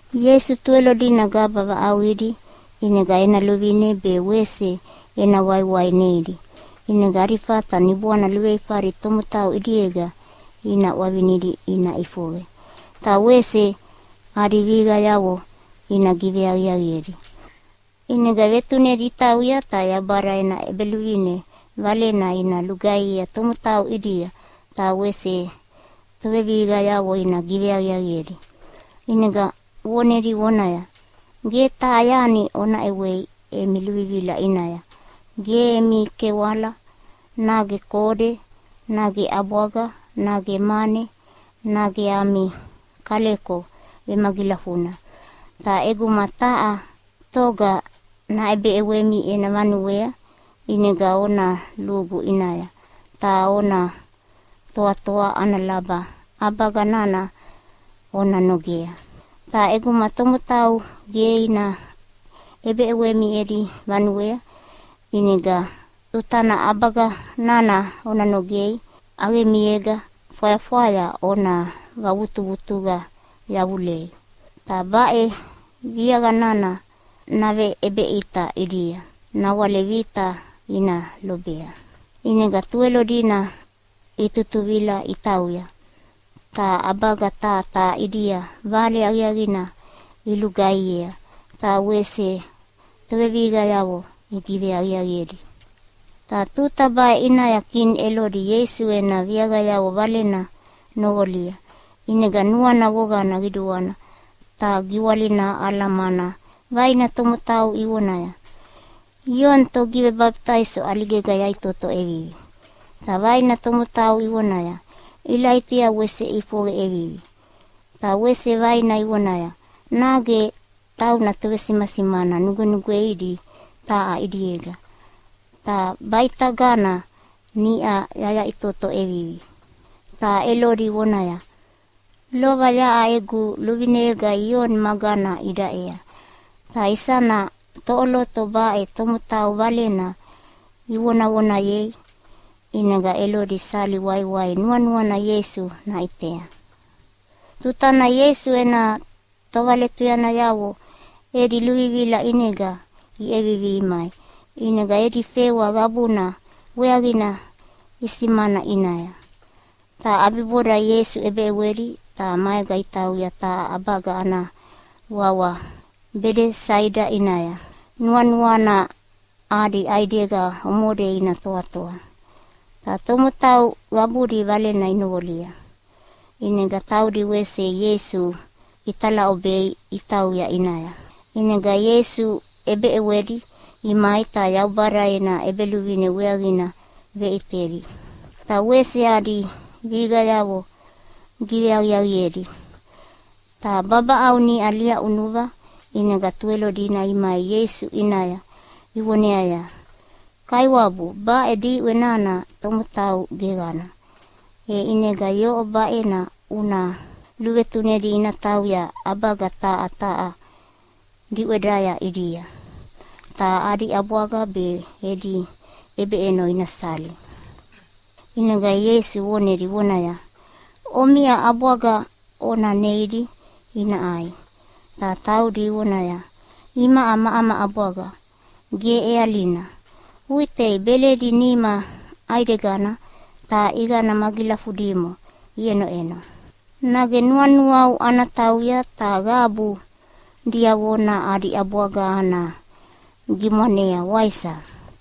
Ieisu Tuwelo dina gaba vaʼauqidi, ʼinega ena luvine be wese ena waiwai neidi, ʼinega adi fata niboana luveifadi tomotau ʼidiega ina ʼwavinidi ina ʼifoqe, ta wese adi vihiqayavo ina giveaqiaqiedi. ʼInega vetunedi itauya ta Yaubada ena ʼEbeluvine valena ina lugaihiea tomotau ʼidia, ta wese tovevihiqayavo ina giveaqiaqiedi. ʼInega vonedi vonaya, “Ge taha yani ona ʼewei emi luvivila ʼinaya, ge emi kewala, nage kode, nage ʼabwaga, nage mane, nage ami kaleko vemagilafuna. Ta ʼeguma taha toga naʼebeʼewemi ena vanuea, ʼinega ona lugu ʼinaya, ta ona toatoa ana laba ʼabaga nana ona nogea. Ta ʼeguma tomotau ge ina ʼebeʼewemi edi vanuea, ʼinega tutana ʼabaga nana ona nogei ʼaqemiega fwayafwaya ona vavutuvutuqa yavulei. Ta baʼe viaqa nana naveʼebeʼita ʼidia nawale vita ina lobea.” ʼInega Tuwelo dina itutuvila itauya, ta ʼabaga taha taha ʼidia vale aqiaqina ilugaihiea, ta wese tovevihiqayavo igiveaqiaqiedi. Ta tuta baʼe ʼinaya kini Elodi Ieisu ena viaqayavo valena noqolia, ʼinega nuana voqana qiduana ta giwalina aʼala mana vaina tomotau ivonaya, “Ioni Togivebabitaiso ʼaligega yaʼitoto ʼevivi.” Ta vaina tomotau ivonaya, “Ilaitia wese ʼifoqe ʼevivi.” Ta wese vaina ivonaya, “Nage tauna tovesimasimana nugwenugweidi taha ʼidiega, ta baʼitagana niʼa yaʼitoto ʼevivi.” Ta Elodi vonaya, “Lova yaʼa egu luvineyega Ioni magana idaʼea, ta isana toʼoloto baʼe tomotau valena ivonavonayei?” ʼInega Elodi sali waiwai nuanuana Ieisu naʼitea. Tutana Ieisu ena tovaletuyanayavo edi luvivila ʼinega iʼevivi imai, ʼinega edi fewa qabuna weaqina isimana ʼinaya. Ta ʼabiboda Ieisu ʼebeʼewedi ta maega itauya taha ʼabaga ana wawa Bedesaida ʼinaya, nuanuana adi ʼaidega omode ina toatoa. Ta tomotau qabudi valena inoqolia, ʼinega taudi wese Ieisu italaʼobei itauya ʼinaya. ʼInega Ieisu ʼebeʼewedi imai ta Yaubada ena ʼEbeluvine weaqina veʼitedi, ta wese adi vihiqayavo giveaqiaqiedi. Ta babaʼau niʼa liaʼunuva, ʼinega Tuwelo dina imai Ieisu ʼinaya ivoneaya, “Kaiwabu, baʼe diʼwe nana tomotau geqana, e ʼinega yoʼo baʼena una luvetunedi ina tauya ʼabaga taha taha diʼwedaya ʼidia, ta adi ʼabwaga be edi ʼebeʼeno ina sali.” ʼInega Ieisu vonedi vonaya, “Omiʼa ʼabwaga ona neidi ina ʼai.” Ta taudi ivoneaya, “Imaʼa ama ʼabwaga ge ʼealina, uʼitei beledi nima ʼaidegana ta ʼiqana magilafudimo iʼenoʼeno. Nage nuanuau ana tauya ta qabu diavona adi ʼabwaga ana gimwanea, waisa?”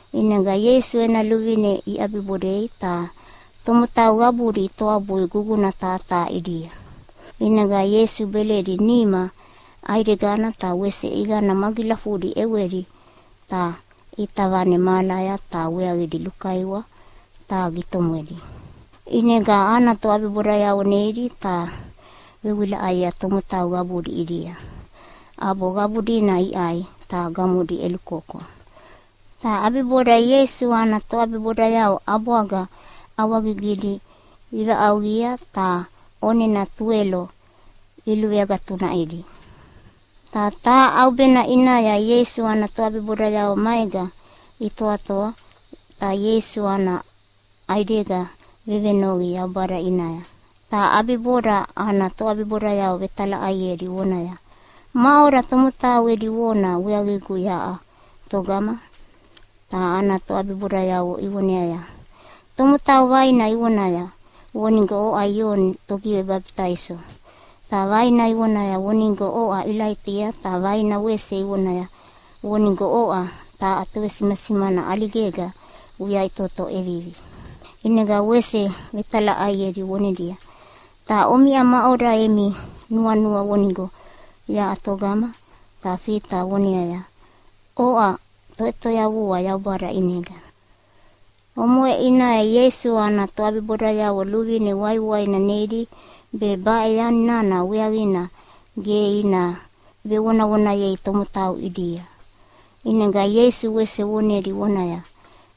ʼInega Ieisu ena luvine iʼabibodei, ta tomotau qabudi itoabui guguna taha taha ʼidia. ʼInega Ieisu beledi nima ʼaidegana ta wese ʼiqana magilafudi ʼewedi ta ʼita vane mahalaya ta weaqidi lukaiwa ta gitomwedi. ʼInega ana toʼabibodayavo neidi ta ivewilaʼayea tomotau qabudi ʼidia, ʼabo qabu dina iʼai ta gamodi ʼelukoko. Ta ʼabiboda Ieisu ana toʼabibodayavo ʼabwaga ʼawagigidi ivaʼauqia ta ʼonena tuwelo iluveagatunaʼidi. Ta taha ʼaubena ʼinaya Ieisu ana toʼabibodayavo maega itoatoa, ta Ieisu ana ʼaidega vevenoqi Yaubada ʼinaya. Ta ʼabiboda ana toʼabibodayavo vetalaʼaiedi vonaya, “Maʼoda tomotau edi vona weaqigu yaʼa togama?” Ta ana toʼabibodayavo ivoneaya, “Tomotau vaina ivonaya vonigo oʼa Ioni Togivebabitaiso, ta vaina ivonaya vonigo oʼa Ilaitia, ta vaina wese ivonaya vonigo oʼa taha tovesimasimana ʼaligega uyaʼitoto ʼevivi.” ʼInega wese vetalaʼaiedi vonedia, “Ta omiʼa, maʼoda emi nuanua vonigo yaʼa togama?” Ta Fita voneaya, “Oʼa Toʼetoyavua Yaubada ʼinega.” Omoʼe ʼinaya Ieisu ana toʼabibodayavo luvine waiwaina neidi be baʼe yani nana weaqina ge ina vevonavonayei tomotau ʼidia. ʼInega Ieisu wese vonedi vonaya,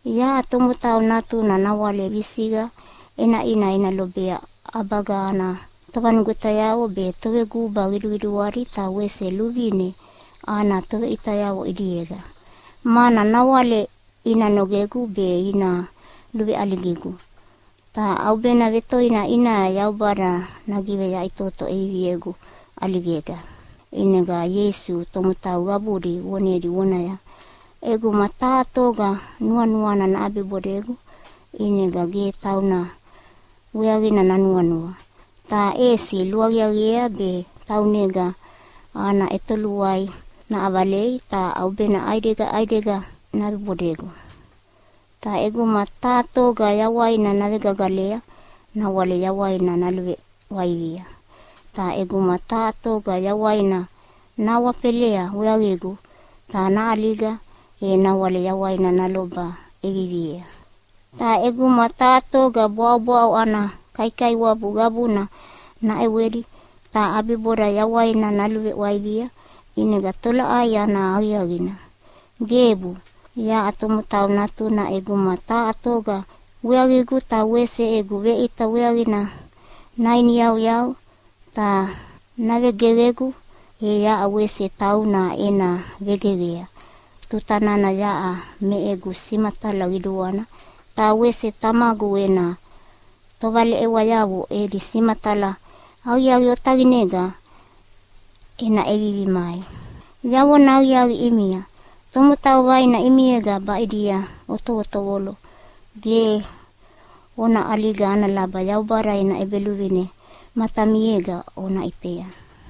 “Yaʼa Tomotau Natuna nawale visiqa ʼenaʼina ena lobea ʼabaga ana tovanugwetayavo be toveguba qiduqiduadi ta wese luvine ana toveʼitayavo ʼidiega, mana nawale ina nogegu be ina luveʼaligigu, ta ʼaubena vetoina ʼinaya Yaubada nagiveyaʼitoto ʼeviviegu ʼaligega.” ʼInega Ieisu tomotau qabudi vonedi vonaya, “ʼEguma taha toga nuanuana naʼabibodegu ʼinega ge tauna weaqina nanuanua, ta ʼesi luaqiaqiea be taunega ana ʼetoluai naʼavalei ta ʼaubena ʼaidega ʼaidega naʼabibodegu. Ta ʼeguma taha toga yawaina navegagalea nawale yawaina naluveʼwaivia, ta ʼeguma taha toga yawaina nahawafelea weaqigu ta naʼaliga, e nawale yawaina naloba ʼeviviea. Ta ʼeguma taha toga bwaʼobwaʼo ana kaikaiwabu qabuna naʼewedi ta ʼabiboda yawaina naluveʼwaivia, ʼinega tolaʼai ana aqiaqina? Gebu! “Yaʼa Tomotau Natuna ʼeguma taha toga weaqigu ta wese egu veʼita weaqina nainiyauyau ta navegeqegu, e yaʼa wese tauna ena vegeqea tuta nana yaʼa me egu simatala qiduana, ta wese Tamagu ena tovaleʼewayavo edi simatala aqiaqi otaqinega ena ʼevivi mai. Yavona aqiaqi ʼimia, tomotau vaina ʼimiega baʼidia otovotovolo ge ona ʼaliga ana laba Yaubada ena ʼEbeluvine matamiega ona ʼitea.”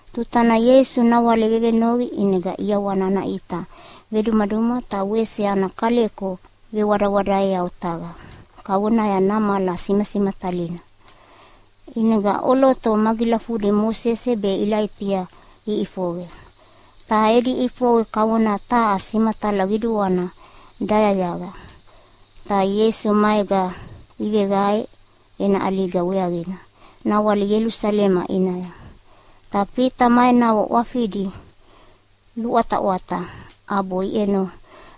Tutana Ieisu nawale vevenoqi ʼinega ʼiawana ana ʼita vedumaduma ta wese ana kaleko vewadawadaeya otaqa kavonaya namala simatalina. ʼInega ʼoloto magilafudi Mosese be Ilaitia iʼifoqe, ta edi ʼifoqe kavona taha simatala qiduana dayayaqa. Ta Ieisu maega iveveqae ena ʼaliga weaqina nawale Ielusalema ʼinaya. Ta Fita ma enavo ʼwafidi luʼwataʼwata ʼabo iʼeno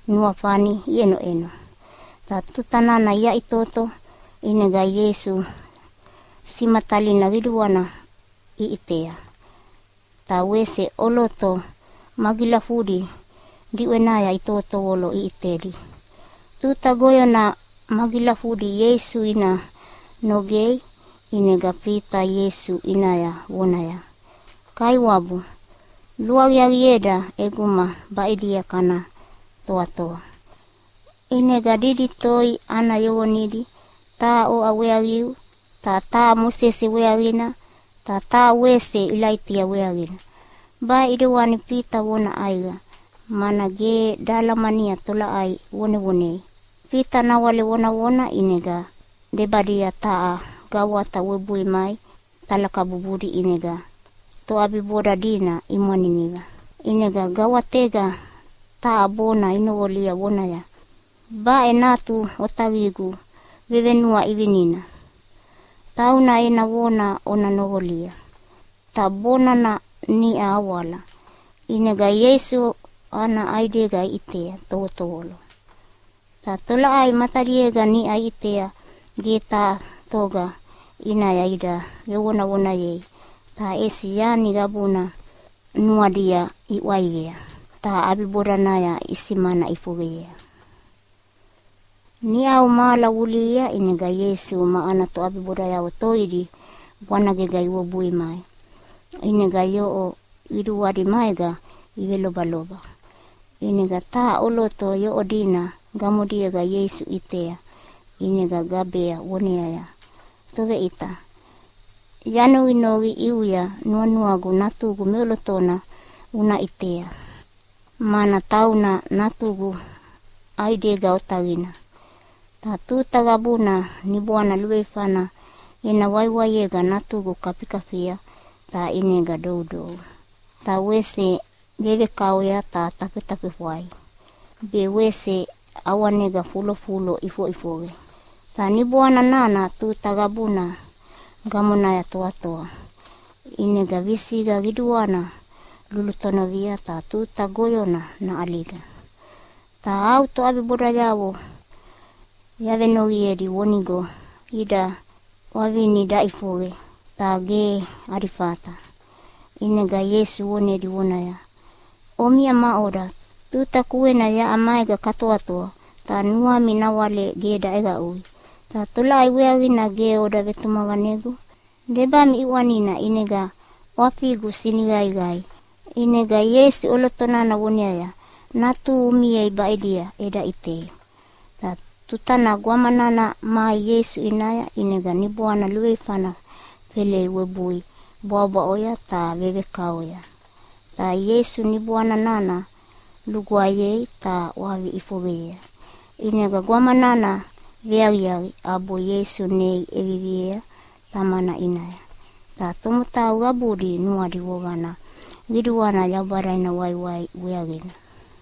nuafani iʼenoʼeno. Ta tuta nana iyaʼitoto ʼinega Ieisu simatalina qiduana iʼitea, ta wese ʼoloto magilafudi diʼwenaya itovotovolo iʼitedi. Tuta goyona magilafudi Ieisu ina nogei, ʼinega Fita Ieisu ʼinaya vonaya, “Kaiwabu, luaqiaqieda ʼeguma baʼidia kana toatoa! ʼInega didi toi ana yoqonidi, taha oʼa weaqiu ta taha Mosese weaqina ta wese taha Ilaitia weaqina.” Baʼe ʼidewani Fita vona ʼaiqa, mana ge dahalamania tolaʼai vonevonei. Fita nawale vonavona, ʼinega debadia taha gawata webui mai talakabubudi ʼinega toʼabiboda dina imwaniniva. ʼInega gawatega taha bona inoqolia vonaya, “Baʼe Natu Otaqigu vevenuaʼivinina. Tauna ena vona ona noqolia!” Ta bona nana niʼa awala, ʼinega Ieisu ana ʼaidega iʼitea tovotovolo. Ta tolaʼai matadiega niʼa iʼitea ge taha toga ʼinaya ida vevonavonayei, ta ʼesi yani qabuna nuadia iʼwaivea. Ta ʼabibodanaya isimana ʼifoqeyea. Niʼau mahala vulihia ʼinega Ieisu ma ana toʼabibodayavo toidi bwanagega iwebui mai, ʼinega yoʼo qiduadi maega ivelobaloba. ʼInega taha ʼoloto yoʼo dina gamodiega Ieisu ʼitea ʼinega gabea voneaya, “Toveʼita, yanoqinoqi ʼiuya nuanuagu natugu meʼolotona una ʼitea, mana tauna natugu ʼaidega otaqina. Ta tuta qabuna niboana luveifana ena waiwaiega natugu kafikafia ta ʼinega doudou, ta wese vevekaoya ta tafetafefwai, be wese ʼawanega fulofulo ʼifoʼifoqe. Ta niboana nana tuta qabuna gamonaya toatoa, ʼinega visiqa qiduana lulutonovia ta tuta goyona naʼaliga. Ta au toʼabibodayavo yavenoqiedi vonigo ida ʼwavini daʼifoqe, ta ge adi fata.” ʼInega Ieisu vonedi vonaya, “Omiʼa maʼoda, tuta kuena yaʼa maega katoatoa ta nuami nawale ge daʼeqaʼui, ta tolaʼai weaqina ge oda vetumaqanegu? Debami ʼiʼwanina ʼinega ʼwafigu siniqaiqai!” ʼInega Ieisu ʼoloto nana voneaya, “Natuhu umiei baʼidia eda ʼitei.” Ta tutana gwama nana mai Ieisu ʼinaya, ʼinega niboana luveifana felei webui bwaʼobwaʼoya ta vevekaoya. Ta Ieisu niboana nana lugwaeyei ta ʼwavi ʼifoqeyea. ʼInega gwama nana veaqiaqi ʼabo Ieisu nei ʼeviviea tamana ʼinaya. Ta tomotau qabudi nuadi voqana qiduana Yaubada ena waiwai weaqina.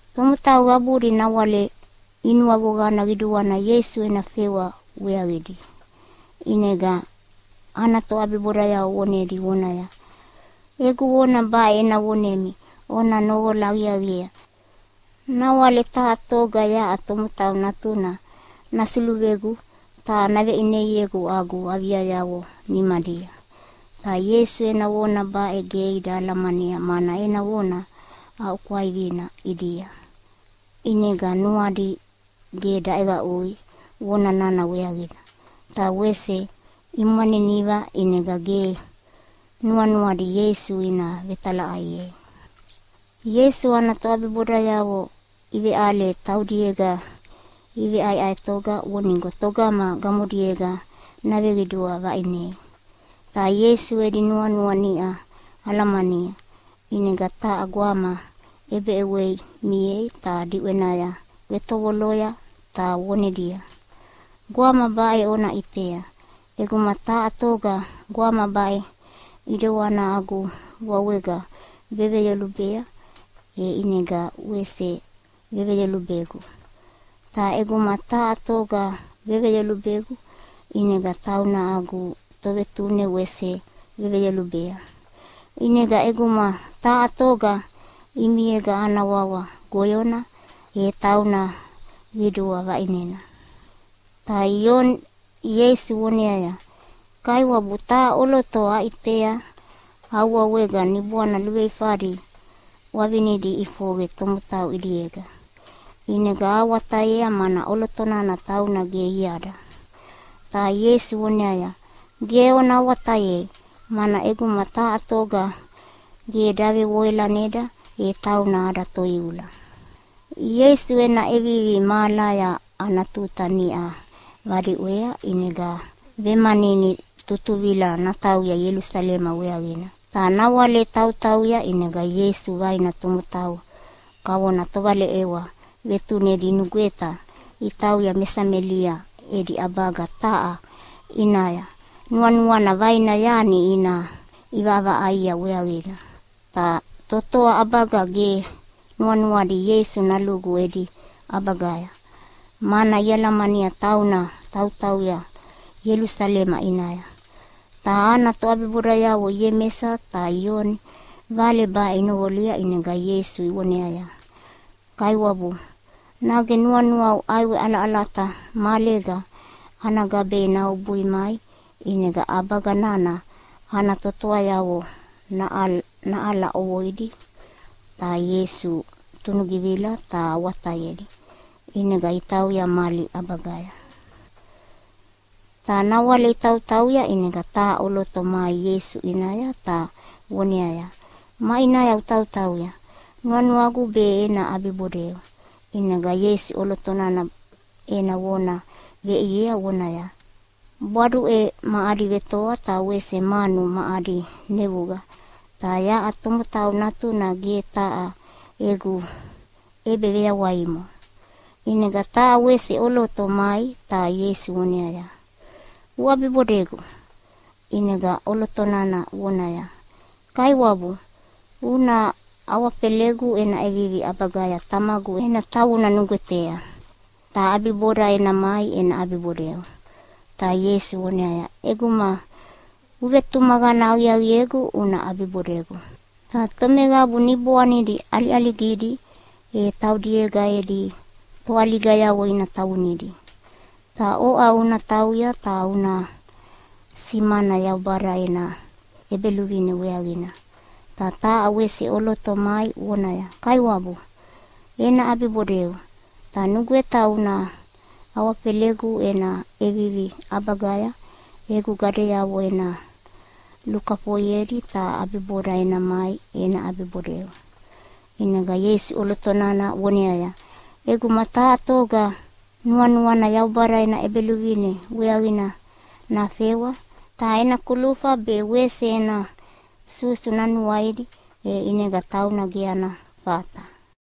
Tomotau qabudi nawale inuavoqana qiduana Ieisu ena fewa weaqidi. ʼInega ana toʼabibodayavo vonedi vonaya, “Egu vona baʼe ena vonemi ona noqola aqiaqiea! Nawale taha toga yaʼa Tomotau Natuna nasuluvegu ta naveʼineiegu agu aviayavo nimadia.” Ta Ieisu ena vona baʼe ge ida alamania, mana ena vona aʼuaʼukwaivina ʼidia. ʼInega nuadi ge daʼeqaʼui vona nana weaqina. Ta wese imwaniniva ʼinega ge nuanuadi Ieisu ina vetalaʼaiei. Ieisu ana toʼabibodayavo iveʼale taudiega iveʼaeʼaetoga vonigo toga gamodiega naveqidua vaʼine. Ta Ieisu edi nuanua niʼa alamania, ʼinega taha gwama ʼebeʼewei miea ta diʼwenaya vetovoloya ta vonedia, “Gwama baʼe ona ʼitea, ʼeguma taha toga gwama baʼe ʼidewana agu wawega veveyolubea, e ʼinega wese veveyolubegu. Ta ʼeguma taha toga veveyolubegu ʼinega tauna agu Tovetune wese veveyolubea. ʼInega ʼeguma taha toga ʼimiega ana wawa goyona, e tauna qidua vaʼinena.” Ta Ioni Ieisu voneaya, “Kaiwabu, taha ʼoloto aʼitea au wawega niboana luveifadi ʼwavinidi iʼifoqe tomotau ʼidiega. ʼInega ahawatayea mana ʼoloto nana tauna ge iada.” Ta Ieisu voneaya, “Ge ona awatayei! Mana ʼeguma taha toga ge davevoalaneda e tauna ada toiula.” Ieisu ena ʼevivi mahalaya ana tuta niʼa vadiʼwea, ʼinega vemanini tutuvila natauya Ielusalema weaqina. Ta nawale tautauya ʼinega Ieisu vaina tomotau kavona tovaleʼewa vetunedi inugweta itauya me Samelia edi ʼabaga taha ʼinaya nuanuana vaina yani ina ʼivaʼavaʼaia weaqina. Ta totoa ʼabaga ge nuanuadi Ieisu nalugu edi ʼabagaya, mana ialamania tauna tautauya Ielusalema ʼinaya. Ta ana toʼabibodayavo Iemesa ta Ioni vale baʼe inoqolia ʼinega Ieisu ivoneaya, “Kaiwabu, nage nuanuau ʼaiwe ʼalaʼalata mahalega ana gabei nawebui mai ʼinega ʼabaga nana ana totoayavo naʼala ʼovoidi?” Ta Ieisu tunugivila ta awatayedi, ʼinega itauya mali ʼabagaya. Ta nawale itautauya ʼinega taha ʼoloto mai Ieisu ʼinaya ta voneaya, “Maʼinaya utautauya nuanuagu be ena ʼabibodeu.” ʼInega Ieisu ʼoloto nana ena vona veʼiea vonaya, “Bwaduʼe ma adi vetoa ta wese manu ma adi nevuqa, ta yaʼa Tomotau Natuna ge taha egu ʼebeveyawaimo.” ʼInega taha wese ʼoloto mai, ta Ieisu voneaya, “Uʼabibodegu!” ʼInega ʼoloto nana vonaya, “Kaiwabu, una awafelegu ena ʼevivi ʼabagaya tamagu ena tavuna nugwetea, ta ʼabiboda ena mai ena ʼabibodeu.” Ta Ieisu voneaya, “ʼEguma uvetumaqana aqiaqiegu una ʼabibodegu, ta tomeqabu niboanidi ʼaliʼaligidi e taudiega edi toʼaligayavo ina tavunidi. Ta oʼa una tauya ta una simana Yaubada ena ʼEbeluvine weaqina.” Ta taha wese ʼoloto mai vonaya, “Kaiwabu, ena ʼabibodeu ta nugweta una awafelegu ena ʼevivi ʼabagaya egu gadeavo ena lukafoiedi ta ʼabiboda ena mai ena ʼabibodeu.” ʼInega Ieisu ʼoloto nana voneaya, “ʼEguma taha toga nuanuana Yaubada ena ʼEbeluvine weaqina nafewa, ta ena kulufa be wese ena susu nanuaidi, e ʼinega tauna ge ana fata.”